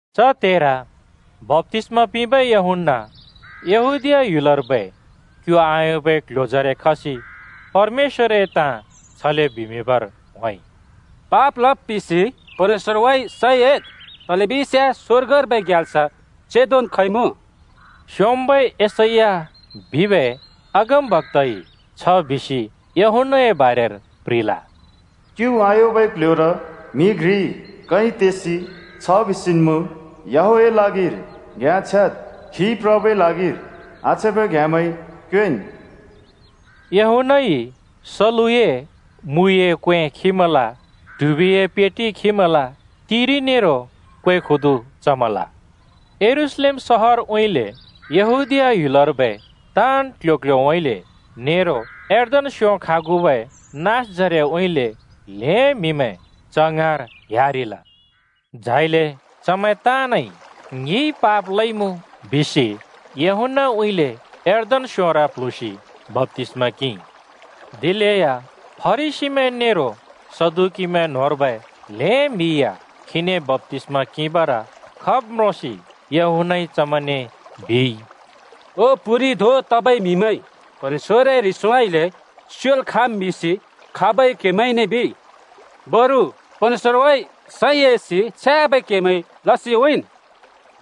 च त्हेर बप्‍तिस्‍मा पिंबै यूहन्‍ना यहूदीया ह्‍युलर्बै क्यु आयोंबै क्ल्ह्‍योजरे खसि परमेश्‍वरए ताँ छले बिमिंबर होंइ। “पाप लब् पिसि परमेश्‍वरउँइँ सैं एद्, तलेबिस्याँ स्‍वर्गर्बै ग्याल्स चेंदोन् खइमुँ।” स्‍योंम्‍बै यशैया बिबै अगमबक्‍ताइ छ बिसि यूहन्‍नाए बारेर प्‍ह्रिल: “क्यु आयोंबै क्ल्ह्‍योर म्‍हि घ्रिइ कै तेसि छ बिसिन् मुँ, ‘याहवेहए ल्हागिर घ्‍याँ छ्याद्! खी प्रबै ल्हागिर आछ्याँबै घ्‍याँमैं क्योंएँन्!’” यूहन्‍नाइ सलुए मुइए क्‍वें खिमल, ट्हुबिए पेटि खिमल, तिरि नेरो क्‍वे खुदु चमल। यरूशलेम सहरउँइँले, यहूदीया ह्‍युलर्बै ताँन् क्‍ल्‍ह्‍यो-क्‍ल्‍ह्‍योउँइँले नेरो यर्दन स्‍यों खागुबै नाँसजरेउँइँले ल्‍हें म्‍हिमैं च ङाँर ह्‍यारिल। झाइले चमैं ताँनइ “ङिइ पाप लइमुँ,” बिसि यूहन्‍नाउँइँले यर्दन स्‍योंर प्‍ल्हुँसि बप्‍तिस्‍मा किंइ। दिलेया फरिसीमैं नेरो सदुकीमैं न्होंर्बै ल्हें म्हि या खीने बप्‍तिस्‍मा किंबर खब् म्रोंसि यूहन्‍नइ चमैंने बिइ, “ओ प्‍हुरि धों तबै म्‍हिमैं, परमेश्‍वरए ह्रिसउँइँले स्योल् खाँम् बिसि खाबइ क्‍हेमैंने बिइ? बरु परमेश्‍वरउँइँ सैं एसि छ्याँबै केमैं लसि उँइँन्।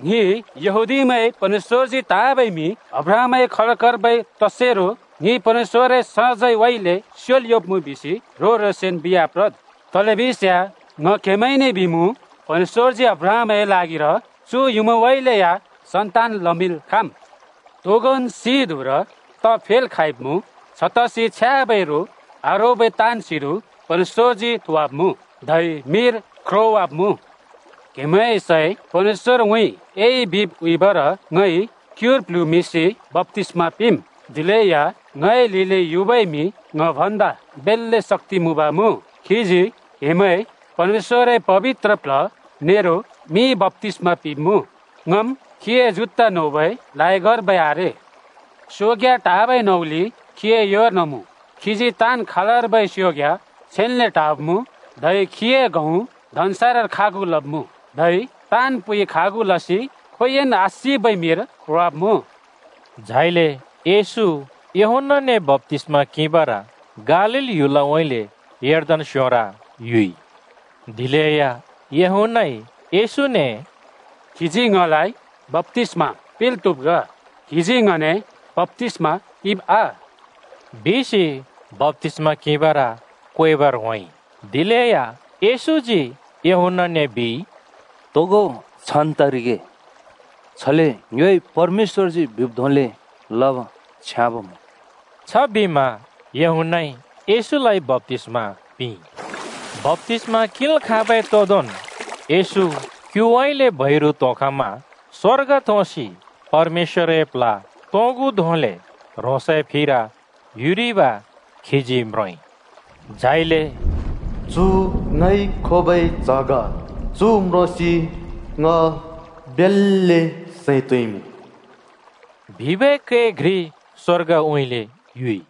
‘ङि यहूदीमैं परमेश्‍वरजी त्‍हाँबै म्‍हि अब्राहमए खलकर्बै तसेरो ङि परमेश्‍वरए सजैंउँइँले स्योल् योंब्‍मुँ,’ बिसि ह्रों-ह्रोंसन् बिआप्रद्। तलेबिस्याँ ङ क्हेमैंने बिमुँ, परमेश्‍वरजी अब्राहमए ल्हागिर चु युँमाउँइँले या सन्‍तान् लमिंल् खाँम्। तोगोंन् सिं धुँर त फेल् खाँइँमुँ। छतसि छ्याँबै रो आरोबै ताँन् सिंधुँ परमेश्‍वरजी थोवाब्मुँ, धै मिर ख्रोंवाब्‍मुँ। “क्‍हेमैंए सैं परमेश्‍वरउँइँ एइ बिब् उँइँबर ङइ क्‍युर प्‍ल्हुँमिंसि बप्‍तिस्‍मा पिंम्। दिलेया ङए लिलि युबै म्‍हि ङ भन्दा बेल्‍ले शक्‍ति मुँब मुँ। खीजी क्‍हेमैं परमेश्‍वरए पबित्र प्ल्ह नेरो मिइ बप्‍तिस्‍मा पिंब्‍मुँ। ङम् खीए जुत्ता नोबै लायगर्बै आरे। सोंग्या टाबै नउलि खीए योर्न मुँ। खीजी ताँन् खालर्बै सोंग्या छेन्‍ले टाब्‍मुँ, धै खीए गहुँ धन्‍सारर खागु लब्मुँ, धै ताँन् पुइ खागु लसि खोंयोंइ आसिबै मिर ख्रोंवाब्‍मुँ।” झाइले येशू यूहन्‍नाने बप्‍तिस्‍मा किंबर गालील ह्‍युलउँइँले यर्दन स्‍योंर युइ। दिलेया यूहन्‍नाइ येशूने “क्‍हिजी ङलाइ बप्‍तिस्‍मा पिंल् त्‍हुब् ग। क्हिजी ङने बप्‍तिस्मा किंब् आ?” बिसि बप्‍तिस्‍मा किंबर क्वेबर होंइ। दिलेया येशूजी यूहन्‍नाने बिइ, “तोगो छान् तरिगे। छले ङ्योइ परमेश्‍वरजी बिब् धोंले लब् छ्याँब मुँ।” छबिमा यूहन्‍नाइ येशूलाइ बप्‍तिस्‍मा पिंइ। बप्‍तिस्‍मा किंल् खाँबै तोदोंन् येशू क्‍युउँइँले बैरु त्‍होंखमा स्वर्ग थोंसि परमेश्‍वरए प्ल्ह तोंगु धोंले ह्रोंसए फिर युरिब खीजी म्रोंइ। झाइले “चु ङइ खोबै च्‍ह ग, चु म्रोंसि ङ बेल्‍ले सैं तोंइमुँ बिबै कै घ्रि स्वर्गउँइँले युइ।”